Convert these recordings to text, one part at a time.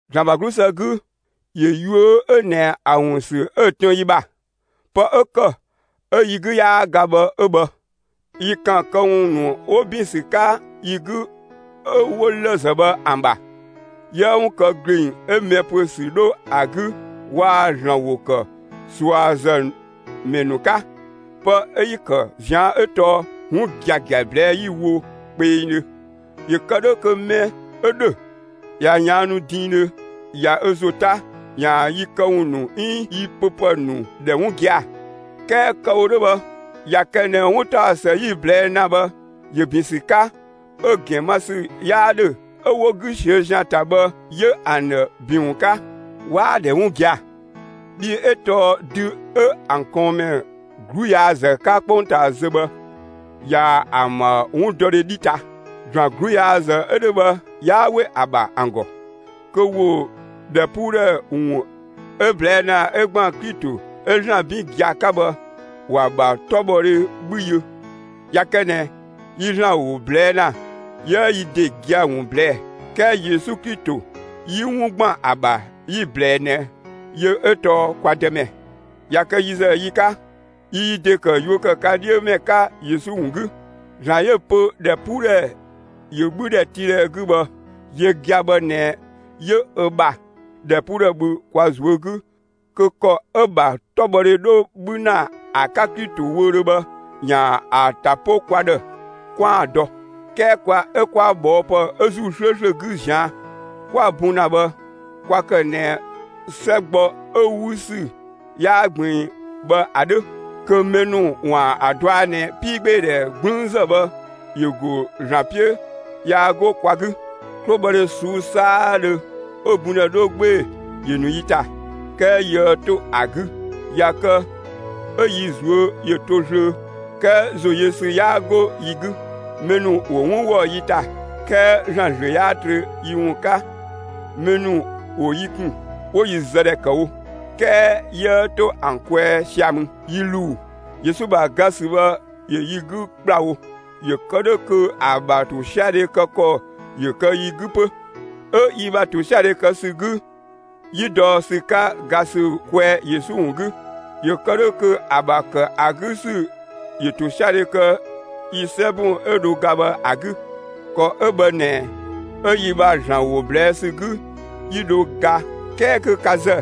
‑Zlan ‑bha 'glusë 'gü, ‑yö yuö 'ö ꞊nɛ ‑a ‑wun ‑sü 'ö‑ tën yi ‑bha. Pë 'ö ‑kë 'ö yi 'gü 'yaa ga bhë 'ö bhë. Yi ‑kan këwun ‑nu 'wo ‑bin ‑sü 'ka yi 'gü 'ö 'wo lëzë bhë ‑an ‑bha; 'yiëë 'wun kë ‑gleng 'ö mɛ ‑püö ‑sü 'dho ‑a 'gü waa‑ ‑Zlan ‑wo ‑kë ꞊suazëmɛ ‑nu 'ka. Pë 'ö 'yi‑ ‑kë ꞊zian' 'ö tɔɔ 'wun giagia ꞊blɛɛ'‑ 'yi‑ wo kpengdhö. ‑Yö kë 'dhö kö mɛ 'ö ‑dhö ꞊ya ꞊yaannu diindhö ꞊ya ö ‑zo 'ta, ‑yaan yi këwun ‑nu 'iin yi pö ‑pë ‑nu ‑dhɛ 'wun gia‑. 'Kɛɛ kë‑ wo 'dhö bhë ꞊ya kë ꞊nɛ 'wuntaɔsë 'yi‑ ꞊blɛɛ' ‑na bhë ‑yö ‑bin ‑sü 'ka, 'ö‑ ‑gɛn ma ‑sü 'yaa 'dhö kö mɛ ‑nu 'ö 'wo 'gü ꞊siö' ‑zian ‑ta bhë, 'yö ‑an ‑dhë ‑bin ‑wun 'ka. 'Waa‑ ‑dhɛ 'wun gia‑, bhii 'ö tɔɔ dü 'ö ‑an ꞊kɔɔnmɛ 'gluyaazë 'ka 'kpongtaa zö bhë ꞊yaa‑ ‑an ‑bha 'wundɔdhe 'dhi ta. ‑Zlan 'gluyaazë 'ö 'dhö bhë 'yaa 'we ‑a ‑bha ‑an ‑gɔ kö ‑wo ‑dhɛpuudhɛ ‑wun 'ö‑ ꞊blɛɛ' ‑na 'ö ‑gban Klito 'ö ‑Zlan 'bin gia‑ 'ka bhë, ‑wa ‑bha 'tɔbhɔdhe 'bhü yö. ꞊Ya kë ꞊nɛ yi ‑Zlan ‑wo ꞊blɛɛ' ‑na, 'yiëë yi ‑de gia‑ ‑wun ꞊blɛɛ'‑; 'kɛɛ Yesu Klito 'yi 'wun ‑gban ‑a ‑bha 'yi‑ ꞊blɛɛ ꞊nɛ yö 'ö tɔɔ kwa Dëmɛ; ꞊ya kë yi ‑zë yi 'ka, yi yi ‑de ‑kë yuö ‑kë ka 'dhiö ‑mɛ 'ka Yesu ‑wun 'gü. ‑Zlan 'yö‑ pö ‑dhɛpuudhɛ ‑yö 'bhü ‑dhɛtiidhɛ 'gü bhë, yö gia‑ bhë ꞊nɛ 'yö ö ‑bha ‑dhɛpuudhɛ bhü kwa ꞊zuö' 'gü kö ‑kɔ 'ö‑ ‑bha 'tɔbhɔdhe 'dho 'bhü ‑na ‑a 'ka Klito wöödhö bhë ‑yaan ‑a ‑ta 'po kwa ‑dhë 'kwaan‑ dɔ. 'Kɛɛ kwa 'ö 'kwa ꞊bhɔɔpë 'ö ‑Zuu 'slööslö 'gü ꞊zian' 'kwa‑ bun ‑na bhë, kwa ‑kë ꞊nɛ 'sɛ gbɔ 'ö‑ 'wü ‑sü 'yaa ꞊gbiin bhë ‑a 'dhö, kö mɛ ‑nu ‑waan ‑a dɔa ꞊nɛ 'piigbeedhɛ 'gblüünzë bhë ‑yö ‑go ‑Zlan 'piö, yaa 'go kwa 'gü. 'Klobhɔdhe ꞊suu'‑ 'saadhö 'ö‑ bundhɛ 'dho 'gbee‑, ‑yö ‑nu yi ‑ta, 'kɛɛ 'yiëë 'to ‑a 'gü; ꞊ya kë 'ö yi ꞊zuö' ‑yö ‑to ꞊zlöö, 'kɛɛ ‑zoyösü 'yaa 'go yi 'gü. Mɛ ‑nu ‑wo 'wun ‑wɔ yi ‑ta, 'kɛɛ ‑Zlan ‑zlö 'yaa trö yi ‑wun 'ka; mɛ ‑nu ‑wo yi ‑kun, 'wo yi zë ‑dhɛ ‑kë wo; 'kɛɛ 'yiëë 'to ‑an kwɛɛ sia‑ mü; yi ‑luu. Yesu ‑bha ga ‑sü bhë ‑yö yi 'gü ‑kplawo; ‑yö kë 'dhö kö ‑a ‑bha ‑tosiadhe kë ‑kɔ ‑yö kë yi 'gü 'pö. 'Ö yi ‑bha ‑tosiadhe kë ‑sü 'gü 'yi dɔ ‑sü 'ka ga ‑sü kwɛɛ Yesu ‑wun 'gü, ‑yö kë 'dhö kö ‑a ‑bha ‑kë ‑a 'gü ‑sü ‑yö ‑tosiadhe kë yi 'sɛbun 'ö dho ga bhë ‑a 'gü. ‑Kɔ 'ö bhë ꞊nɛ 'ö yi ‑bha ‑Zlan ‑wo ꞊blɛɛ' ‑sü 'gü, 'yi dho ga 'kɛɛ kö ka ‑zë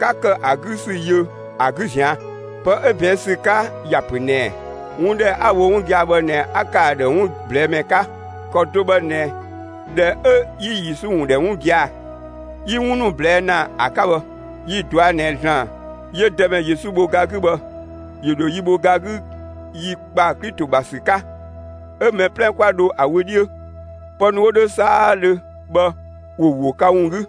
'ka ‑kë ‑a 'gü ‑sü yö ‑a 'gü ꞊zian'. Pë 'ö ꞊bɛɛn' ‑sü 'ka ‑ya ‑pö ꞊nɛɛ: 'Wun ‑dhɛ 'a‑ wo 'wun gia‑ bhë ꞊nɛ 'a ‑kë ‑a ‑dhë 'wun ꞊blɛɛ' ‑mɛ 'ka. ‑Kɔ do bhë ꞊nɛ, ꞊dhɛ 'ö 'yi Yesu ‑wun ‑dhɛ 'wun gia‑ 'yi 'wun ‑nu ꞊blɛɛ' ‑na ‑a 'ka bhë. Yi‑ ꞊dɔa' ꞊nɛ ‑Zlan 'yö Dëmɛ Yesu bho ga 'gü bhë, ‑yö ‑dho yi bho ga 'gü yi ‑kpa Klito ‑bha ‑sü 'ka, 'ö mɛ 'plɛ 'kwa dho ‑a wö 'dhiö. Pë ‑nu 'wo 'dhö 'saadhö bhë ‑wo ‑wo ka ‑wun 'gü.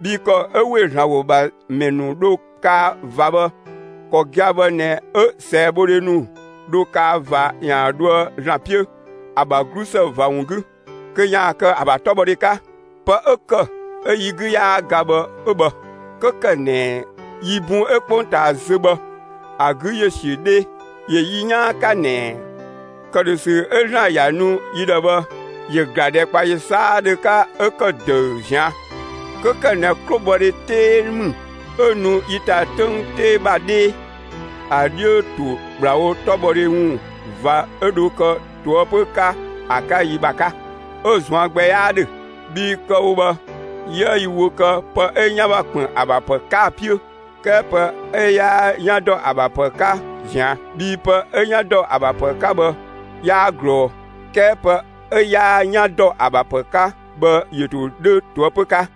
Bhii ‑kɔ 'ö ‑we ‑Zlan ‑wo ‑bha ‑mɛ ‑nu dho kaa ꞊va bhë, ‑kɔ gia‑ bhë ꞊nɛ 'ö ꞊sɛɛbhodhe ‑nu dho kaa ꞊va ‑yaan dhoë ‑Zlan 'piö ‑a ‑bha 'glusë ꞊va ‑wun 'gü, kö ‑yaan kë ‑a ‑bha 'tɔbhɔdhe 'ka. Pë 'ö ‑kë 'ö yi 'gü 'yaa ga bhë 'ö bhë. 'Kö ‑kë ꞊nɛ yi bun 'ö 'kpongtaa zö bhë ‑a 'gü ‑yö ‑siö 'dhee, ‑yö yi 'yaan 'ka ꞊nɛ ‑këdhösü 'ö ‑Zlan ‑ya nu yi ‑dhë bhë ‑yö ‑gla ‑dhɛkpaɔyi 'saadhö 'ka 'ö ‑kë ‑dëü ꞊zian'. 'Kö ‑kë ꞊nɛ 'klobhɔdhe 'tee ‑mü 'ö nu yi ‑ta 'töng 'tee ‑bha 'dhee, ‑a 'dhiö ‑to ‑kplawo 'tɔbhɔdhe ‑wun ꞊va 'ö dho kë ꞊toëpö 'ka ‑a 'ka yi ‑bha 'ka, 'ö‑ ꞊zuan' gbɛ 'yaa 'dhö. Bhii kë‑ wo bhë, 'yiëë yi wö kë pë 'ö 'yan ‑bha ‑kpën ‑a ‑bha ‑pë 'ka‑ 'piö, 'kɛɛ pë 'ö 'yaa 'yan ‑dɔ ‑a ‑bha ‑pë 'ka ꞊zian'. Bhii pë 'ö 'yan ‑dɔ ‑a ‑bha ‑pë 'ka bhë 'yaa ꞊glɔɔ, 'kɛɛ pë 'ö 'yaa 'yan ‑dɔ ‑a ‑bha ‑pë 'ka bhë ‑yö ‑to 'dhö ꞊toëpö 'ka.